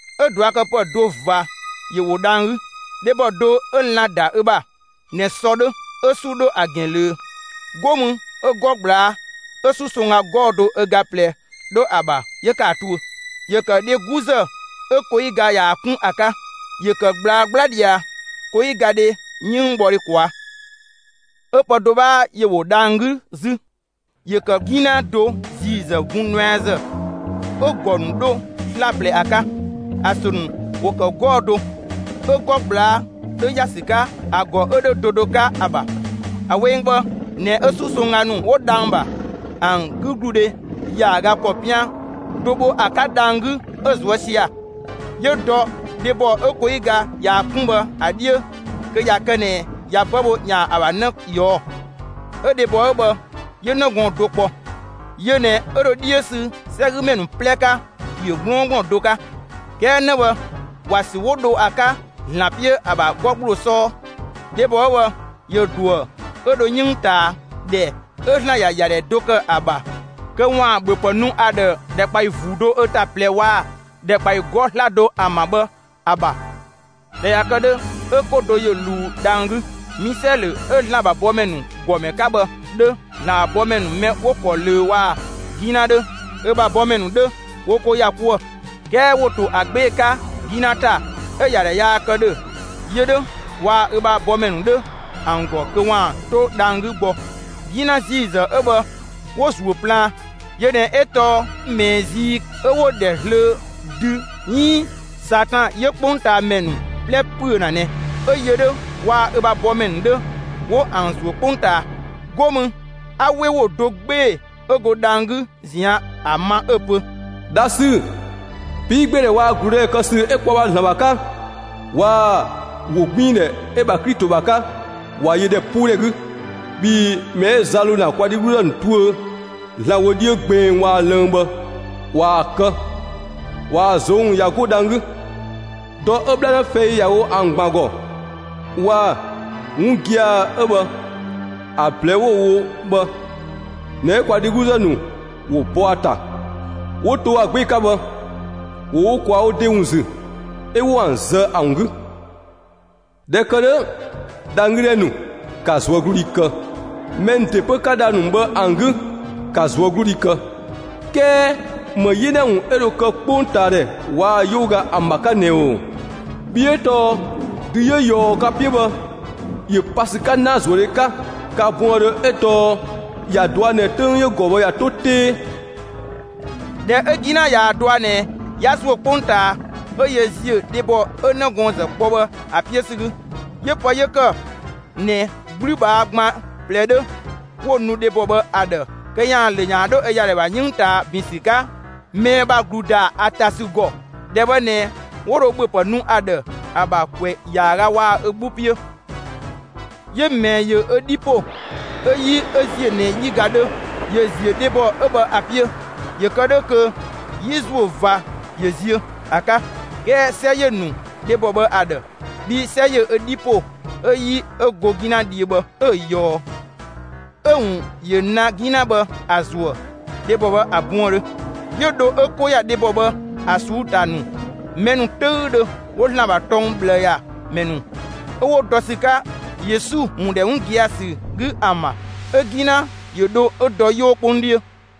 'Ö ꞊duakëpë do ꞊va ‑yö ‑wo dhang‑ 'gü: Dhebɔ do 'ö lan‑ ‑da ö ‑bha ꞊nɛ sɔ 'dhö 'ö 'su 'dho ‑a ‑gɛn ꞊löö, 'go mü 'ö 'gɔ ꞊gblaa' 'ö 'susongga 'gɔɔ‑ do ö ga ꞊plɛ 'dho ‑a ‑bha 'yö ‑kë ‑a tuö. ‑Yö ‑kë dhe 'guzë 'ö koyigadhe ꞊yaa‑ 'kun ‑a 'ka; ‑yö ‑kë ꞊gblaa 'gbla ꞊dhia koyigadhe 'yënngbhɔdhe ꞊kwaa'. 'Ö pë do 'bhaa ‑yö ‑wo dhang‑ 'gü 'zü: ‑Yö ‑kë 'gina do ‑ziizë bun nuɛazë 'ö‑ ‑gɔ ‑nu 'dho 'slaplɛ ‑a 'ka. ‑A ‑sö ‑nu ‑wo ‑kë 'gɔɔ‑ do. 'Ö 'gɔ ꞊gblaa' 'dhö ‑ya ‑sü 'ka ‑a ‑gɔ 'ö ‑dhö do do 'ka ‑a ‑bha. ‑A weng bhë ꞊nɛ 'ö 'susongga ‑nu 'wo dhang‑ ‑bha, ‑an 'gügludhe ‑yaaga ‑kɔ 'pian do bho ‑a 'ka dhang‑ 'gü 'ö‑ ꞊zuë' sia‑. 'Yö dɔ dhebɔ 'ö koyiga ꞊yaa‑ 'kun bhë ‑a 'dhiö, kö ꞊ya kë ꞊nɛ ꞊ya 'bë bho 'yaan‑ ‑a ‑bha 'në ꞊yɔɔ'‑. 'Ö dhebɔ 'ö bhë 'yö 'në gɔɔn‑ do kpɔ. Yö ꞊nɛ 'yö dho 'dhiö ‑sü 'sɛgümɛ ‑nu 'plɛ 'ka ‑piö 'gblɔɔngblɔn do 'ka. 'Kɛɛ 'në bhë ‑wa ‑sü 'wo dho ‑a 'ka ‑Zlan 'piö ‑a ‑bha 'gɔ ‑gbloo 'sɔɔ. Dhebɔ 'ö bhë ‑yö ꞊duë, 'ö dho 'yënng ꞊taa, ‑dhɛ 'ö ‑Zlan ‑ya ‑yadhɛ do ‑kë ‑a ‑bha kö ‑waan ‑bhöpë nu ‑a ‑dhë ‑dhɛkpaɔyi ‑vuu do ö ‑ta ꞊plɛ waa‑ ‑dhɛkpaɔyi 'gɔɔ‑ 'slado ‑an ‑bha bhë ‑a ‑bha. ꞊Dhɛ ꞊ya kë 'dhö, 'ö 'ko do ‑yö ꞊luu dhang‑ 'gü. Misɛlö 'ö ‑Zlan ‑bha bɔmɛ ‑nu ‑gɔmɛ do 'ka bhë 'dhö ‑Zlan ‑bha bɔmɛ ‑nu mɛ 'wo‑ ‑kɔ ꞊löö, waa‑ 'gina 'dhö, ö ‑bha bɔmɛ ‑nu 'dhö, 'wo 'ko ‑ya 'kuë. 'Kɛɛ ‑wo ‑to ‑a 'gbee‑ 'ka 'gina ‑ta 'ö ‑yadhɛ yaa kë ‑dhö yö 'dhö waa‑ ö ‑bha bɔmɛ ‑nu 'dhö ‑an ‑gɔ kö ‑waan 'to dhang‑ 'gü gbɔ. 'Gina ‑ziizë 'ö bhë, 'wo‑ ‑zuö plaan. Yö ꞊nɛ 'ö tɔɔ ꞊mɛɛ zii, 'ö 'wo‑ ‑dhɛ zlöö dü 'iin Satan 'yö 'kpongtaamɛ ‑nu 'plɛ ‑püö ‑na ꞊nɛ. 'Ö yö 'dhö waa‑ ö ‑bha bɔmɛ ‑nu 'dhö, 'wo ‑an ‑zuö 'kpongtaa. 'Go mü 'a 'we ‑wo do 'gbee‑ 'ö go dhang‑ 'gü ꞊zian' ‑a ma 'ö‑ pö: «Dha ‑sü, 'piigbeedhɛ waa‑ ‑gludëdhɛ kë ‑sü 'ö kwa ‑bha ‑Zlan ‑bha 'ka waa‑ ‑wogbiindhɛ 'ö‑ ‑bha Klito ‑bha 'ka ꞊wa yö ‑dhɛpuudhɛ 'gü. Bhii mɛ 'ö za ‑lo ‑na kwa dhegluzë ‑nu tuö ‑Zlan wö 'dhiö gbeng waa‑ lënng bhë, ꞊waa‑ kë, ꞊waa‑ ꞊zong' ꞊ya 'go dhang‑ 'gü. Dɔ 'ö 'bhlanë fɛi ‑ya wo ‑an ‑gban ‑gɔ waa‑ 'wun gia‑ 'ö bhë ‑a ꞊blɛɛ'‑ 'wo‑ wo bhë ꞊nɛ 'ö kwa dhegluzë ‑nu ‑wo bɔ ‑a ‑ta 'wo to ‑a 'gbee‑ 'ka bhë. ‑Wo wo ‑kwaa wo ‑de ‑wun ‑zü 'ö 'wo ‑an zë ‑a ‑wun 'gü. ‑Dhɛ ‑kë 'dhö, dhang‑ 'gü ‑dhɛ ‑nu, ‑ka ꞊zuögludhi kë, mɛ ‑nu ‑de 'pö 'ka dhang‑ ‑nu bhë ‑an 'gü, ‑ka ꞊zuögludhi kë! 'Kɛɛ ‑më 'yena ‑wun 'ö dho kë 'kpongtaadhɛ waa‑ 'yooga ‑an ‑bha 'ka ꞊nɛ ‑oo! Bhii 'ö tɔɔ dü 'yö ꞊yɔɔ ka 'piö bhë, ‑yö pa ‑sü 'ka ‑naazuëdhe 'ka ka buëndhö 'ö tɔɔ ‑ya ꞊dua' ꞊nɛ 'töng 'yö‑ ‑gɔ bhë ꞊ya 'to 'tee.» ꞊Dhɛ 'ö 'gina ꞊yaa‑ dɔa ꞊nɛ 'ya ‑zuö 'kpongtaa 'ö yö ‑ziö dhebɔ 'ö 'nëgɔɔnzë kpɔ bhë ‑a 'piö ‑sü 'gü. 'Yö pë 'yö ‑kë ꞊nɛ 'gblübhaa gban ꞊plɛ 'dhö 'wo‑ nu dhebɔ bhë ‑a ‑dhë kö ‑yaan ‑lö ‑yaan 'dho ö ‑yadhɛ ‑bha 'yënng ꞊taa ‑bin ‑sü 'ka ꞊mɛɛ ‑bha ‑glu ‑da ‑a ‑ta ‑sü ‑gɔ; ‑dhɛ bhë ꞊nɛ 'wo dho ‑bhöpë nu ‑a ‑dhë ‑a ‑bha, ‑kwɛ ‑yaaga waa‑ ö 'gbu 'piö. 'Yö ꞊mɛɛ ‑yö ö 'dhi ‑po 'ö 'yi 'ö ‑ziö ꞊nɛ 'yiga 'dhö ‑yö ‑ziö dhebɔ 'ö bhë ‑a 'piö, ‑yö kë 'dhö kö 'yi ‑zuö ꞊va ‑yö ziö ‑a 'ka. 'Kɛɛ 'sɛ ‑yö ‑nu dhebɔ bhë ‑a ‑dhë. Bhii 'sɛ ‑yö ö 'dhi ‑po 'ö 'yi 'ö go 'gina dhiö bhë, 'ö‑ ꞊yɔɔ. 'Ö‑ ‑wun ‑yö ‑na 'gina bhë ‑a ‑zuë dhebɔ bhë ‑a buëndhö. 'Yö dho 'ö 'ko ‑ya dhebɔ bhë ‑a ꞊suu'‑ ‑ta ‑nu, mɛ ‑nu 'töüdhö 'wo ‑Zlan ‑bha tɔng ꞊bhlë ‑ya, mɛ ‑nu 'ö 'wo dɔ ‑sü 'ka Yesu ‑wun ‑dhɛ 'wun gia‑ ‑sü 'gü ‑an ‑bha. 'Ö 'gina ‑yö dho 'ö dɔ 'yoo 'kpong 'dhiö.